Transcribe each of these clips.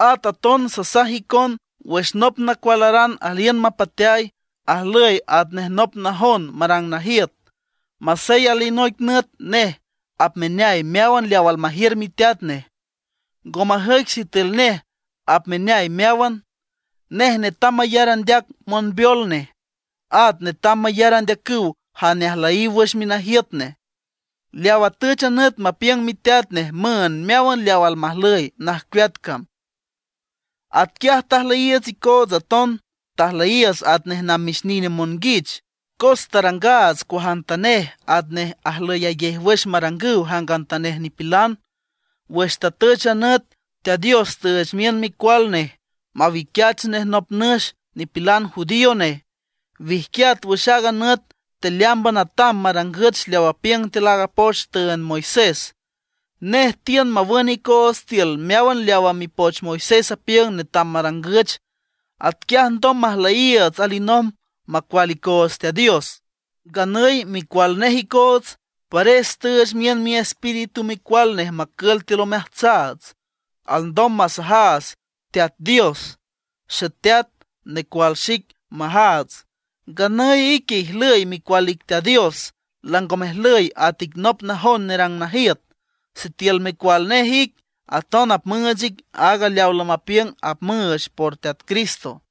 At aton sasaj icon: Wüx nop nacualaran aliün mapateay, ajlüy atnej nop najon marang najiüt, masey alinoic nüt nej apmeneay meáwan leaw almajiür miteat nej. Ngo majüic sitiül nej apmeneay meáwan. Nej netam mayar andeac monbeol nej, at netam mayar andeacüw jane ajlüyiw wüx minajiüt nej, leaw atüch a nüt mapiüng miteat nej müünd meáwan leaw almajlüy najcueat cam. Atquiaj tajlüyiiüts icoots aton, tajlüyiiüts atnej namix nine monguich. Cos tarangaats cuajantanej atnej ajlüyayej wüx marangüw jangantanej nipilan. Wüx tatüch a nüt, Teat Dios tüüch miün Micual nej, mawiquiach nej nop nüx nipilan judío nej, wijquiat wüx aaga nüt tealeámban atam marangüch leaw apiüng tiül aaga poch tüünd Moisés. Nej tiün mawün icoots tiül meáwan leawa mipoch Moisés apiüng netam marangüch, atquiaj alndom majlüyiiüts alinomb macual icoots Teat Dios. Nganüy micual nej icoots, pares tüüch miün Miespíritu Micual nej macül tiül omeajtsaats, alndom masajaats Teat Dios: “¡Xeteat, necual xic!” majaats. Nganüy ique ijlüy micual ic Teat Dios, lango mejlüy at ic nop najon nerang najiüt. Sitiül micual nej ic, aton apmüüch ic aaga leaw lamapiüng apmüüch por Teat Cristo.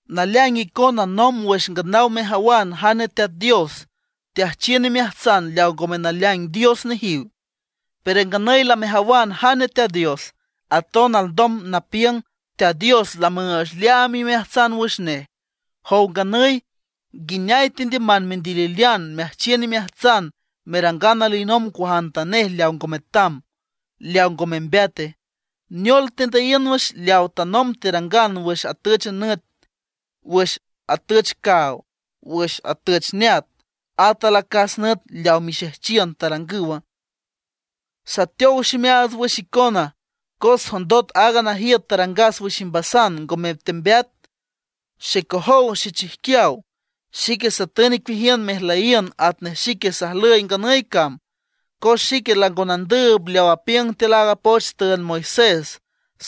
Naleaing icona nomb wüx nganaw mejawan jane Teat Dios, teajchiün imeajtsan leaw ngome naleaing dios nejiw. Pero nganüy lamejawan jane Teat Dios, aton alndom napiüng Teat Dios lamüüch leaam imeajtsan wüx nej. Jow nganüy, ¿nguineay tendiüman mendililean meajchiün imeajtsan merangan alinomb cuajantanej leaw ngo metam, leaw ngo membeate? ¿Neol tendüyiün wüx leaw tanomb terangan wüx atüch nüt, wüx atüch caaw, wüx atüch neat, at alacas nüt leaw mixejchiün tarangüwa? Sateow ximeaats wüx icona cos jondot aaga najiüt tarangas wüx imbasan ngome tembeat. Xecojow xechijquiaw, xique satün icueajiün mejlüyiün atnej xique sajlüy nganüy cam, cos xique lango nandüüb leaw apiüng tiül aaga poch tüünd Moisés,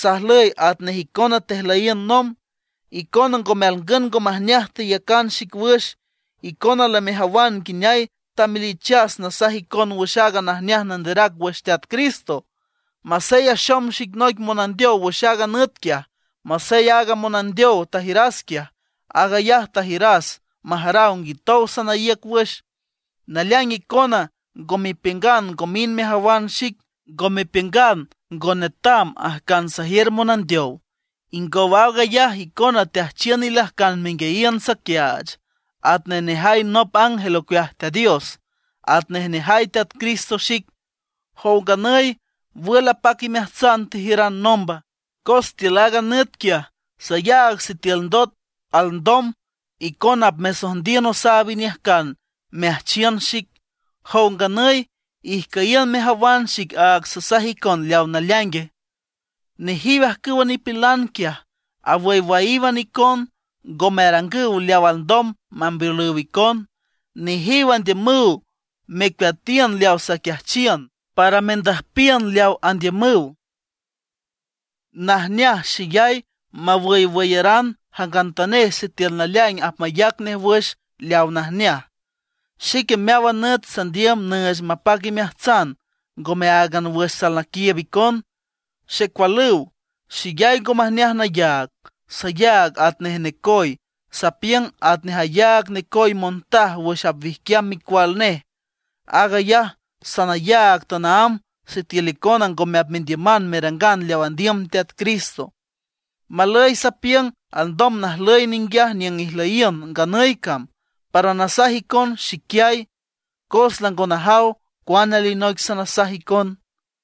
sajlüy atnej icona tejlüyiün nomb; icona ngome alngün ngo majneaj teyacan xic wüx. Icona lamejawan nguineay tamelichas nasaj icon wüx a najneaj nanderac wüx Teat Cristo, masey axom xic noic monandeow wüx aaga nüt quiaj. Masey aaga monandeow tajiüras quiaj, aag ayaj tajiüras majaraw nguitow sanaíüc wüx. Naleaing icona ngo mepiüngan ngo mind mejawan xic, ngo mepiüngan ngo netam ajcan sajiür monandeow. Ingow aag ayaj icona teajchiün ilajcan menguiayiün saquiaach, atnej nejay nop ángel ocueaj Teat Dios, atnej nejay Teat Jesucristo xic. Jow nganüy, ¿wül apac imeajtsan tejiüran nomba? Cos tiül aaga nüt quiaj sayaag sitiül ndot alndom icona apmesojndiün osaab iniüjcan meajchiün xic. Jow nganüy, ¿ijcüyiün mejawan xic aag sasaj icon leaw naleaingue? Nejiw ajcüwa nipilan quiaj awüywüyíwan icon; ngome arangüw leawa alndom mambeolüw icon. Nejiw andiümüw mecueatiün leaw saquiajchiün, para mendüjpiün leaw andiümüw. Najneaj xeyay mawüywüyaran jangantanej sitiül naleaing apmayac nej wüx leaw najneaj. Xique meáwan nüt sandiüm nüüch mapac imeajtsan, ngome áagan wüx salnaquiiüb icon. Xecualüw, xeyay ngo majneaj nayaag. Sayaag atnej necoy, sapiüng atnej ayaag necoy montaj wüx apwijquiam micual nej. Aag ayaj sanayaag tanaámb sitiül icona ngome apmendiüman merangan leaw andiüm Teat Cristo. Malüy sapiüng alndom najlüy ninguiaj niüng ijlüyiün nganüy cam, para nasaj icon xiquiay, cos lango najaw cuane alinoic sanasaj icon.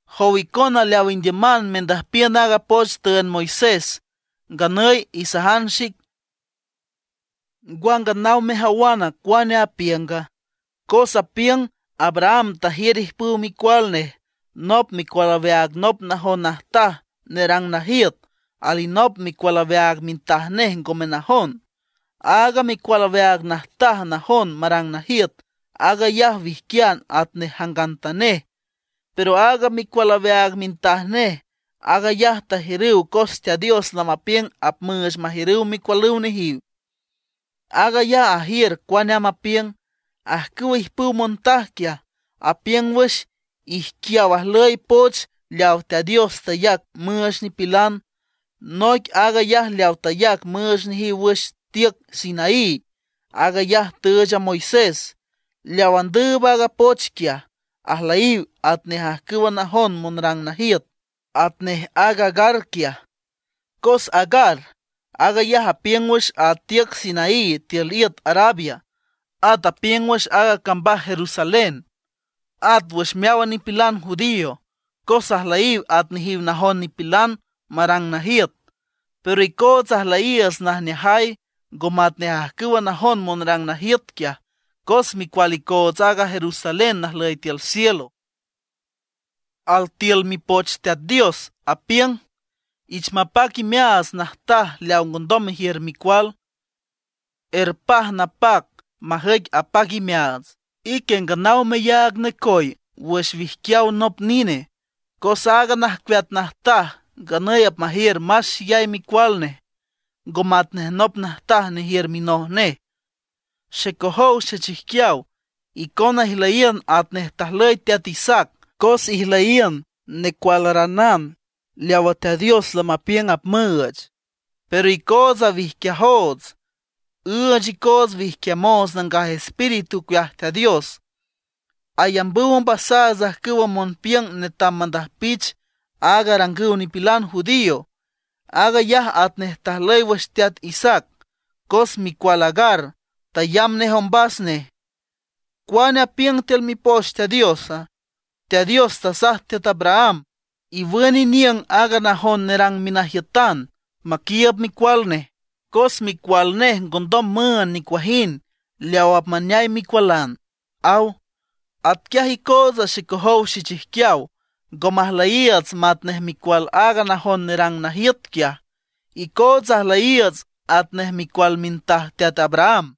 Jow icona leaw indiüman mendüjpiün aaga poch tüünd Moisés, nganüy isajan xic: ¿Ngwa nganaw mejawana cuane apiünga? Cos apiüng Abraham tajiür ijpüw micual nej. Nop micual aweaag nop najon najtaj nerang najiüt, alinop micual aweaag mintaj nej ngome najon. Aaga micual aweaag najtaj najon marang najiüt, aag ayaj wijquian atnej jangantanej. Pero aaga micual aweaag mintaj nej, aag ayaj tajiürüw cos Teat Dios lamapiüng apmüüch majiürüw micualüw nejiw. Aag ayaj ajiür cuane amb apiüng. Ajcüwa ijpüw montaj quiaj, apiüng wüx ijquiaw ajlüy poch leaw Teat Dios tayac müüch nipilan. Noic aag ayaj leaw tayac müüch nejiw wüx tiüc Sinaí, aag ayaj tüüch a Moisés. Leaw andüüb aaga poch quiaj, ajlüyiw atnej ajcüwa najon monrang najiüt, atnej aaga Agar quiaj. Cos Agar, aag ayaj apiüng wüx a tiüc Sinaí tiül iüt Arabia; at apiüng wüx aaga cambaj Jerusalén, at wüx meáwan nipilan judío, cos ajlüyiw at nejiw najon nipilan marang najiüt. Pero icootsa ajlüyiiüts najneajay, ngo matnej ajcüwa najon monrang najiüt quiaj, cos micual icoots aaga Jerusalén najlüy tiül cielo. Altiül Mipoch Teat Dios apiüng: Ich mapac imeaats najtaj leaw ngondom mejiür micual; erpaj napac majüic apac imeaats, ique nganaw meyaag necoy wüx wijquiaw nop nine. Cos aaga najcueat najtaj nganüy apmajiür más xeyay micual nej, ngo matnej nop najtaj nejiür minoj nej. Xecojow xechijquiaw, icona ijlüyiün atnej tajlüy teat Isaac, cos ijlüyiün necualaranan leawa Teat Dios lamapiüng apmüüch. Pero icootsa wijquiajoots, üüch icoots wijquiamoots Nangaj Espíritu ocueaj Teat Dios, ayambüw ombasaats ajcüwa monpiüng netam mandüjpich aag arangüw nipilan judío. Aag ayaj atnej tajlüy wüx teat Isaac, cos micual Agar tayamb nej ombas nej. ¿Cuane apiüng tiül Mipoch Teat Diosa? Teat Dios tasaj teat Abraham: “Iwün iniüng aaga najon nerang minajiütan maquiiüb micual nej, cos micual nej ngondom müünd nicuajind leawa apmaneay micualan”, aw. Atquiaj icootsa xecojow xechijquiaw, ngo majlüyiiüts matnej micual aaga najon nerang najiüt quiaj; icootsa ajlüyiiüts atnej micual mintaj teat Abraham.